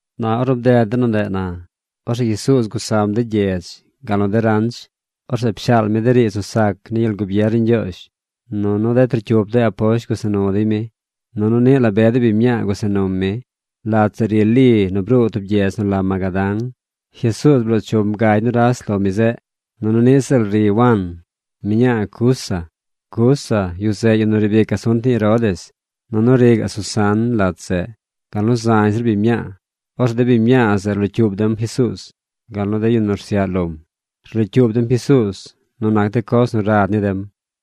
Na ornu bded de nu ndeꞌ na, orzeꞌ Jesuuz gusam de gyedz, gal nu de ranch. Orzeꞌ pshaal mi de riidz nu sac ni gyel gubier ni Ñgyoozh. Nunu de trocyup de aposht gusa nu dey mi. Nunu niꞌ la be de biñ mñaa gusa num mi. Lat zeꞌ ri Li nu bruu tub gyedz nu la Magadán. Jesuuz bloo chum gagy nuras lo mi zeꞌ. Nunu niꞌ ziꞌl ri Wan, mñaa Cuza. Cuza yu zeꞌ yu nu riib ic asunt ni Herodes. Nunu ri gaꞌ Susan lat zeꞌ, gal nu zañ zir biñ mñaa. Orzeꞌ de biñ mñaa zeꞌ rlocyuub dem Jesuuz, gal nu de yu nu rsyaꞌ lom. Rlocyuub dem Jesuuz nu nac de coz nu rad ni dem.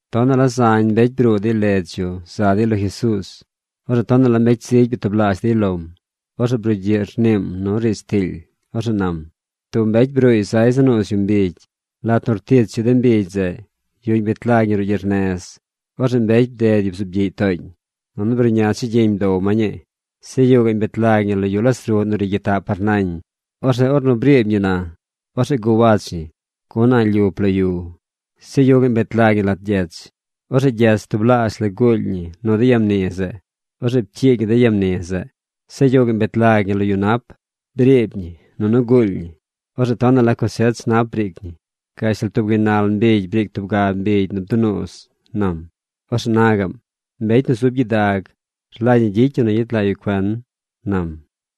Tonaꞌ la zañ mbecy bruu dey ledz yu za dey lo Jesuuz. Orzeꞌ tonaꞌ la mbecy zigy byatublaazh dey lom. Orzeꞌ brugyiꞌ rniim nu riidz tiily. Orzeꞌ nam: ―Tub mbecy bruuy zay za nuuz yu mbigy. Lat nu rtich yu de mbigy zeꞌ, yuꞌñ bet lag ñi ruꞌ gyernez. Orzeꞌ mbecy bded yu bzuub gyiꞌy tooñ. Nunu bruꞌña chigyiñ bdow ma ñii. Zeꞌ yuꞌ gaꞌñ bet lag ñi lo yu las ruꞌ nu ri gyitaꞌ par nañ. Orzeꞌ ornu briib ñi na, orzeꞌ guwach ñi, gun a̱ꞌ lyup lo yu. Zeꞌ yuꞌ gaꞌñ bet lag ñi lat gyech. Orzeꞌ gyech tublaazh la guuly ñi nu de ya mni zeꞌ. Orzeꞌ pcyiig ñi de ya mni zeꞌ. Zeꞌ yuꞌ gaꞌñ bet lag ñi lo yu nap. Briib ñi nunu guuly ñi. Orzeꞌ tonaꞌ la cosech nap briic ñi. Gashtal tub gaynal mbigy briic tub ga mbigy nu bdunuuz ―nam. Orzeꞌ na gaꞌm: ―¡Mbecy nu zub gyidag rlagy ñi gyicy yu nu gyet lag yu cuen! ―nam.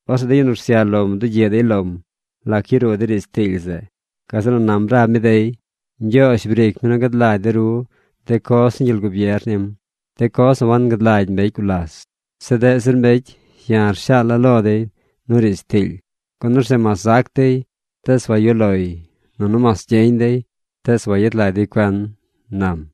Orzeꞌ de yu nu rsyaꞌ lom bdugyiꞌ dey lom lac yaruu de riidz tiily zeꞌ. Gazeꞌ nu nam rab mi dey: ―Ñgyoozh briic mi nu gad lagy de ru de coz ni gyel gubier nim, de coz nu wagad lagy mbecy gulas. Zeꞌ deꞌ zir mbecy ya̱ shaala̱ lo dey nu riidz tiily. Gun orzeꞌ mas zac dey, tees wayuꞌ loy, nunu mas gyeñ dey, tees wayet lag dey cuen ―nam.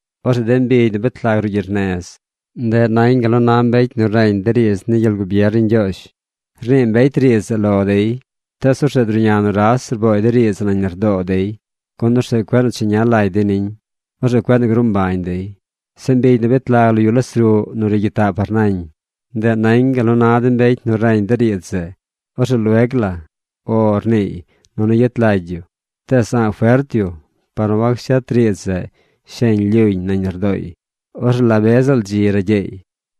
Orzeꞌ de mbigy nu bet lag ruꞌ gyernez, ndeꞌ nañ gal nu na mbecy nu reñ de riidz ni gyel gubier ni Ñgyoozh. Rnii mbecy riidz zeꞌ lo dey, tees orzeꞌ druꞌña nuras rbooy de riidz zeꞌ nañ lardoo dey, gun orzeꞌ cueꞌ nu cheña lagy dey niñ. Orzeꞌ cueꞌ nu gruu mbañ dey. Zeꞌ mbigy nu bet lag lo yu las ruꞌ nu ri gyitaꞌ par nañ, ndeꞌ nañ gal nu na de mbecy nu reñ de riidz zeꞌ. Orzeꞌ lueg la “O” rniiy nunu yet lagy yu. Tees a̱ꞌ fert yu par nu wacshet riidz zeꞌ sheñ lyuñ nañ lardooy. Orzeꞌ la be ziꞌl dzi ragyeey.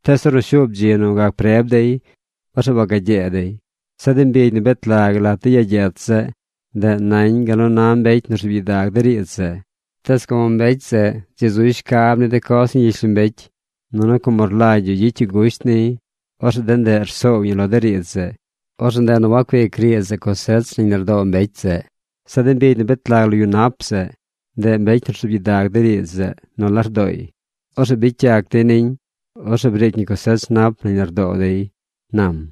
Tees ornu shuub dzi nu gac preb dey, orzeꞌ wagyee dey. Zeꞌ de mbigy nu bet lag lat de ya gyech zeꞌ, ndeꞌ nañ gal nu na mbecy nu rzuub gyidag de riidz zeꞌ. Tees como mbecy zeꞌ dzi zuy shcab ni de coz ni gyishlombecy, nunu como rlagy yu gyicy yu gusht niy, orzeꞌ de ndeꞌ rsoow ñi lo de riidz zeꞌ. Orzeꞌ ndeꞌ nu wacuic riidz zeꞌ cosech nañ lardoo mbecy zeꞌ. Zeꞌ de mbigy nu bet lag lo yu nap zeꞌ, ndeꞌ mbecy nu rzuub gyidag de riidz zeꞌ nu lardooy. Orzeꞌ bicy yac dey niñ. Orzeꞌ briic ñi cosech nap nañ lardoo dey ―nam.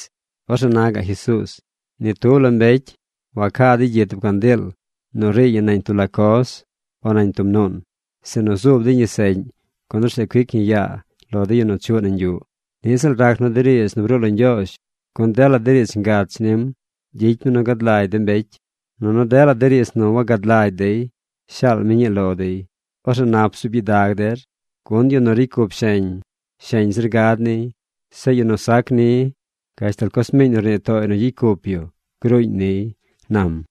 Orzeꞌ na gaꞌ Jesuuz: ―Ni tub la mbecy wacaa dey gyi tub candiil nu riiy ñi nañ tub la coz, o nañ tub nuun, sinu zuub dey ñi seꞌñ, gun orzeꞌ cuic ñi yaa lo de yu nu chuꞌ nañ yuꞌ. Niꞌ ziꞌl rac nu de riidz nu bruu lo Ñgyoozh. Gun dela de riidz ngach nim gyicy mi nu gad lagy de mbecy, nunu dela de riidz nu wagad lagy dey, shaal mi ñii lo dey. ’Orzeꞌ nap bzuub gyidag der, gun yu nu ricy cup sheñ, sheñ zir gad niy. Zeꞌ yu nu sac ni, gashtal coz miiñ nu rnii tooy nu gyicy cup yu gruuñ niy ―nam.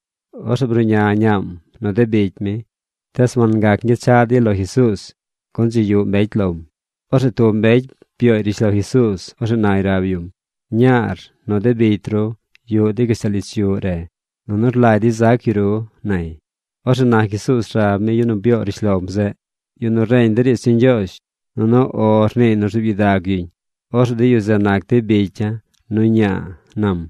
Orzeꞌ bruꞌña ñaam, nu de bicy mi. Tees wangac ñgyechaꞌ dey lo Jesuuz, gun dzi yuꞌ mbecy lom. Orzeꞌ tub mbecy byooy rishlo Jesuuz. Orzeꞌ nay rab yum: ―Ñaar nu de bicy ru yuꞌ dey gashtal ich yuꞌ re, nunu rlagy dey zac yu ru ―nay. Orzeꞌ na Jesuuz rab mi yu nu byoo rishlom zeꞌ: ―Yu nu reñ de riidz ni Ñgyoozh nunu “O” rniiy nu rzuub gyidag yuñ, orzeꞌ de yu zeꞌ nac dey bicya̱ nu ña̱a̱ ―nam.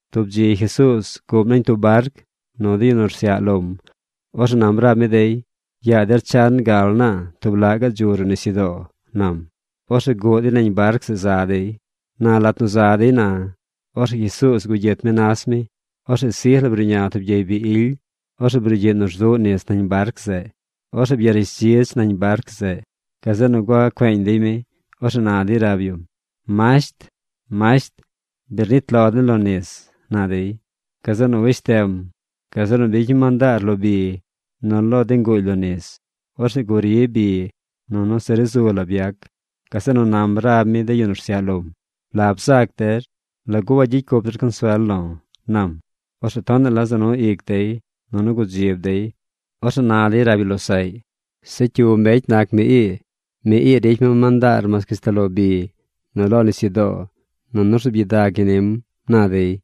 Tub dzi Jesuuz guꞌm nañ tub barc nu de yu nu rsyaꞌ lom. Orzeꞌ nam rab mi dey: ―Yaa der chan gal naa tub laꞌ gaꞌ dzu ruꞌ nisyudoo ―nam. Orzeꞌ guꞌ dey nañ barc zeꞌ za dey. Na lat nu za dey na, orzeꞌ Jesuuz gugyit mi nas mi. Orzeꞌ sij la bruꞌña tub gyey bi ily. Orzeꞌ brugyiꞌ nu rzuꞌ nis nañ barc zeꞌ. Orzeꞌ byarishdzidz nañ barc zeꞌ. Gazeꞌ nu gua cueeñ dey mi. Orzeꞌ na dey rab yum: ―¡Masht, masht, bi rnit lo den lo nis! ―na dey. Gazeꞌ nu weshtem. Gazeꞌ nu bicy mi mandaar lo bi, nu lo de nguuly lo nis. Orzeꞌ guri bi. Nunu se ri zu la byac. Gazeꞌ nu nam rab mi de yu nu rsyaꞌ lom: ―¿La bzaac der? ¿Lagu wagyicy cup der consuel lo̱? ―nam. Orzeꞌ tonaꞌ la za nu ic dey nunu gudzib dey. Orzeꞌ na dey rab yu losaꞌy: ―¿Zeꞌ cyu mbecy nac mi ii? Mi ii ricy mi mandaar mas gashtal lo bi nu lo nisyudoo, nunu rzuub gyidag ñi nim ―na dey.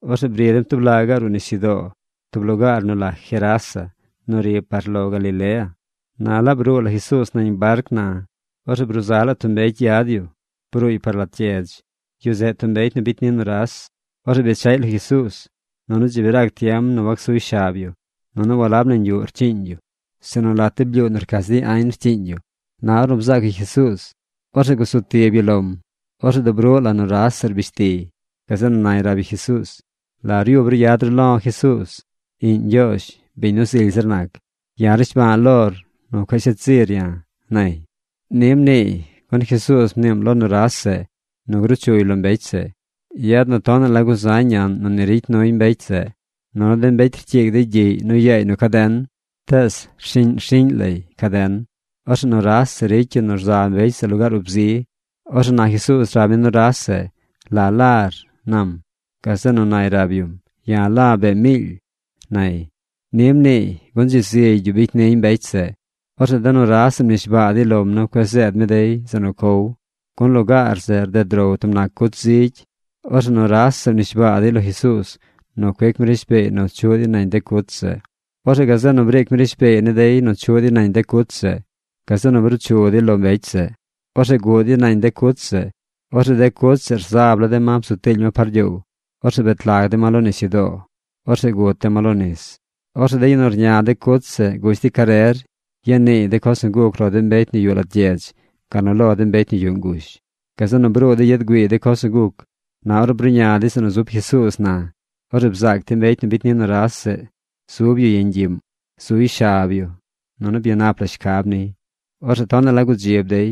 Orzeꞌ bri dem tub laꞌ gaꞌ ruꞌ nisyudoo, tub lugaar nu la Gerasa nu ri par lo Galilea. Na laab bruu la Jesuuz nañ barc na, orzeꞌ bruu za la tub mbecy yad yu. Bruuy par lat gyedz. Yu zeꞌ tub mbecy nu bicy ni nuras. Orzeꞌ bechaꞌy lo Jesuuz. Nunu dzi bi rac tiem nu wacsuy shab yu. Nunu walab nañ yuꞌ rcyiiñ yu, sinu lat de blyuu nu rcach dey añ rcyiiñ yu. Na ornu bzaac yu Jesuuz, orzeꞌ gusu tib yu lom. Orzeꞌ dub ruꞌ la nuras zeꞌ rbish tiy. Gazeꞌ nu nay rab yu Jesuuz: ―¿La ryub ru yad ru lo̱ Jesuuz, iꞌñ Ñgyoozh, biñ nu zily zir nac? ¡Ya̱ rnishba̱a̱ lor nu cueꞌ shet zir ya̱! ―nay. Ni mniiy, gun Jesuuz mniim lo nuras zeꞌ nu gruchuy lo mbecy zeꞌ. Yad nu tonaꞌ la guzañ ñaꞌn nu ni ricy nuy mbecy zeꞌ. Nunu de mbecy rcyiig dey gyiꞌy nu yaay nu caden. Tees rshiꞌñ rshiꞌñ lay caden. Orzeꞌ nuras zeꞌ ricy yu nu rza mbecy zeꞌ lugaar ub zi. Orzeꞌ na Jesuuz rab mi nuras zeꞌ: ―¿La lar? ―nam. Gazeꞌ nu nay rab yum: ―Ya̱ la̱ bee miily ―nay. Ni mniiy gun dzi zigy yu bicy niy mbecy zeꞌ. Orzeꞌ de nuras zeꞌ mnishbaa dey lom nu cueꞌ zeed mi dey zeꞌ nu cow. Gun lugaar zeꞌ rded row tub nac cuch zigy. Orzeꞌ nuras zeꞌ mnishbaa dey lo Jesuuz nu cuic mi rishbeey nu chuꞌ dey nañ de cuch zeꞌ. Orzeꞌ gazeꞌ nu briic mi rishbeey ni dey nu chuꞌ dey nañ de cuch zeꞌ. Gazeꞌ nu bruu chu dey lo mbecy zeꞌ. Orzeꞌ guꞌ dey nañ de cuch zeꞌ. Orzeꞌ de cuch zeꞌ rzab la de ma bzu tiily ma par gyoow. Orzeꞌ bet lag de ma lo nisyudoo. Orzeꞌ gut de ma lo nis. Orzeꞌ de yu nu rña de cuch zeꞌ gush dey carer ya niiy de coz nu guc lo de mbecy nu yuꞌ lat gyedz, gal nu lo de mbecy nu yuꞌ ngush. Gazeꞌ nu bruu dey yad güiiy de coz nu guc. Na ornu bruꞌña dey zeꞌ nu zub Jesuuz na, orzeꞌ bzaac dey mbecy nu bicy ni nuras zeꞌ zub yu yeñ gyiꞌm. Zuy shab yu, nunu byanap la shcab niy. Orzeꞌ tonaꞌ la gudzib dey.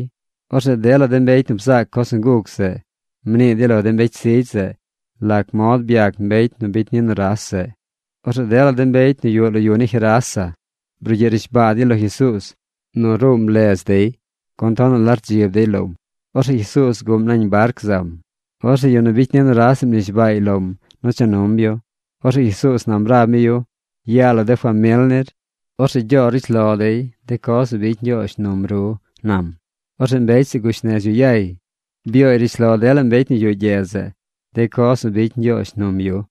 Orzeꞌ dela de mbecy nu bzaac coz nu guc zeꞌ mnii dey lo de mbecy zigy zeꞌ lac mod byac mbecy nu bicy ni nuras zeꞌ. Orzeꞌ dela de mbecy nu yuꞌ lo yu ni Gerasa brugyiꞌ rnishbaa dey lo Jesuuz nu ruum ledz dey, gun tonaꞌ la rdzib dey lom. Orzeꞌ Jesuuz guꞌm nañ barc zam. Orzeꞌ yu nu bicy ni nuras zeꞌ mnishbaay lom nu cha num yu. Orzeꞌ Jesuuz nam rab mi yu: ―Yaa lo de famil nir. Orzeꞌ gyoor rishlo dey de coz nu bicy Ñgyoozh num ru ―nam. Orzeꞌ mbecy zeꞌ gush nez yu yay. Byooy rishlo dela mbecy nu yuꞌ gyedz zeꞌ de coz nu bicy Ñgyoozh num yu.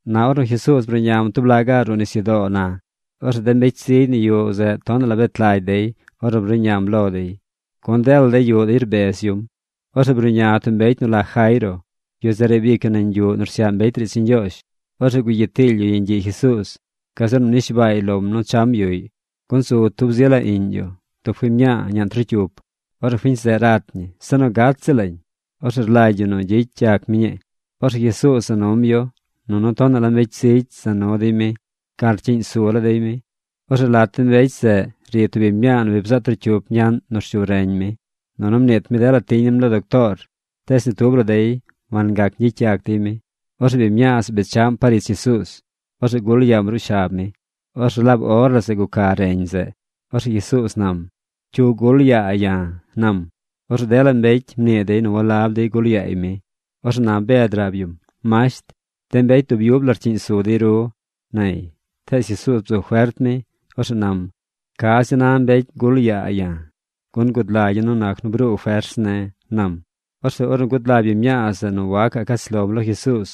Na ornu Jesuuz bruꞌñam tub laꞌ gaꞌ ruꞌ nisyudoo na, orzeꞌ de mbecy zigy nu yuꞌ zeꞌ tonaꞌ la bet lagy dey ornu bruꞌñam lo dey. Gun dela dey yuꞌ dey rbez yum. Orzeꞌ bruꞌña tub mbecy nu la Jairo. Yu zeꞌ riib ic yu nañ yuꞌ nu rsyaꞌ mbecy riidz ni Ñgyoozh. Orzeꞌ gugyit tiily yu yeñ gyiꞌ Jesuuz. Gazeꞌ nu mnishbaay lom nu cham yuꞌy. Gun zu tub zi la iꞌñ yu, tub fiñ mñaa ñaꞌn trocyup. Orzeꞌ fiñ zeꞌ rat ñi. Se nu gat ziꞌl lañ. Orzeꞌ rlagy yu nu gyicy yac mi ñii. Orzeꞌ Jesuuz za num yu, nunu tonaꞌ la mbecy zigy za nu dey mi gal rcyiꞌñ su la dey mi. Orzeꞌ lat de mbecy zeꞌ ri tub biñ mñaa nu bi bzaꞌ trocyup ñaꞌn nu rshu reñ mi. Nunu mniit mi dela tiñ nim lo doctoor, tees ni tub la dey wangac ñgyicy yac dey mi. Orzeꞌ biñ mñaa zeꞌ bechaꞌm par ich Jesuuz. Orzeꞌ gul yaam ruꞌ shab mi. Orzeꞌ laab or la zeꞌ guca reñ zeꞌ. Orzeꞌ Jesuuz nam: ―¿Cyu gul yaa ya̱? ―nam. Orzeꞌ dela mbecy mnii dey nu walab dey gul yaay mi. Orzeꞌ na Bed rab yum: ―Masht, de mbecy dub yub la rcyiꞌñ su dey ru ―nay. Tees Jesuuz bzu fert mi. Orzeꞌ nam: ―Ca zi na mbecy gul yaa ya̱. Gun gud lagya̱, nu nac nu bruu fers ne̱ ―nam. Orzeꞌ ornu gud lagy biñ mñaa zeꞌ nu wacaꞌ cach lom lo Jesuuz,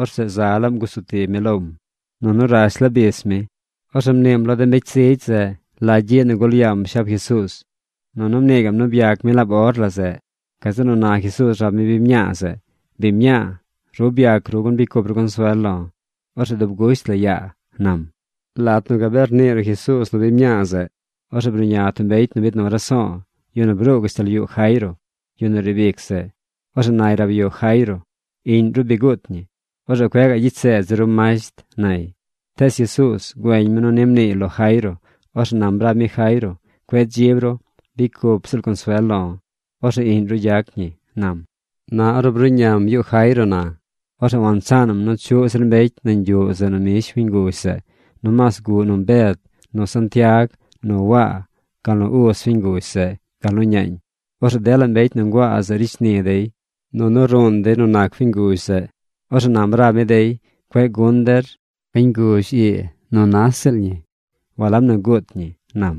orzeꞌ za laam gusu tib mi lom. Nunu rash la bis mi. Orzeꞌ mniim lo de mbecy zigy zeꞌ la gyiꞌ nu gul yaam shab Jesuuz. Nunu mnii gaꞌm nu byac mi laab or la zeꞌ. Gazeꞌ nu na Jesuuz rab mi biñ mñaa zeꞌ: ―Biñ mñaa, ru byac ru gun bicy cup ru consuel lo̱. Orzeꞌ dub gusht la yaa ―nam. Lat nu gabee rnii ruꞌ Jesuuz nu biñ mñaa zeꞌ, orzeꞌ bruꞌña tub mbecy nu biid nu raso̱o̱, yu nu bruu gashtal yuꞌ Jairo, yu nu riib ic zeꞌ. Orzeꞌ nay rab yu Jairo: ―Iꞌñ ru bi guut ñi. Orzeꞌ cueꞌ gaꞌ gyicy seed zir ru masht ―nay. Tees Jesuuz güeñ mi nu ni mniiy lo Jairo. Orzeꞌ nam rab mi Jairo: ―Cueꞌ dzib ru. Bicy cup ziꞌl consuel lo̱. Orzeꞌ iꞌñ ru gyac ñi ―nam. Na ornu bruꞌñam yuꞌ Jairo na, orzeꞌ wansaanaꞌm nu chuꞌ zir mbecy nañ yuꞌ zeꞌ nu mbish fiñ nguzh zeꞌ. Nomaas guꞌ num Bed nu Santiag, nu Waa, gal nu uz fiñ nguzh zeꞌ gal nu ñaañ. Orzeꞌ dela mbecy nu nguaa zeꞌ ricy shni dey, nunu ruun dey nu nac fiñ nguzh zeꞌ. Orzeꞌ nam rab mi dey: ―Cueꞌ gun der. Fiñ nguzh ii nu nas ziꞌl ñi. Walab nu guut ñi ―nam.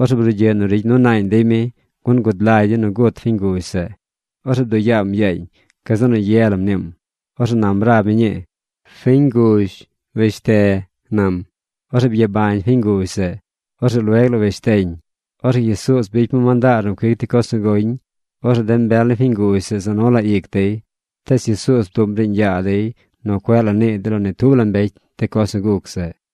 Orzeꞌ brugyiꞌ nu rigy nu ñaañ dey mi, gun gud lagy dey nu gut fiñ nguzh zeꞌ. Orzeꞌ bduꞌ yaam yaañ. Gazeꞌ nu ye la mniim. Orzeꞌ nam rab mi ñii: ―¡Fiñ nguzh, weshte! ―nam. Orzeꞌ byabañ fiñ nguzh zeꞌ. Orzeꞌ lueg la weshteñ. Orzeꞌ Jesuuz bicy mi mandaar nu cuic dey coz nu goñ. Orzeꞌ de mbel ni fiñ nguzh zeꞌ za nu la ic dey. Tees Jesuuz bduꞌm riiñ yaa dey nu cueꞌ la nii dey lo ni tub la mbecy de coz nu guc zeꞌ.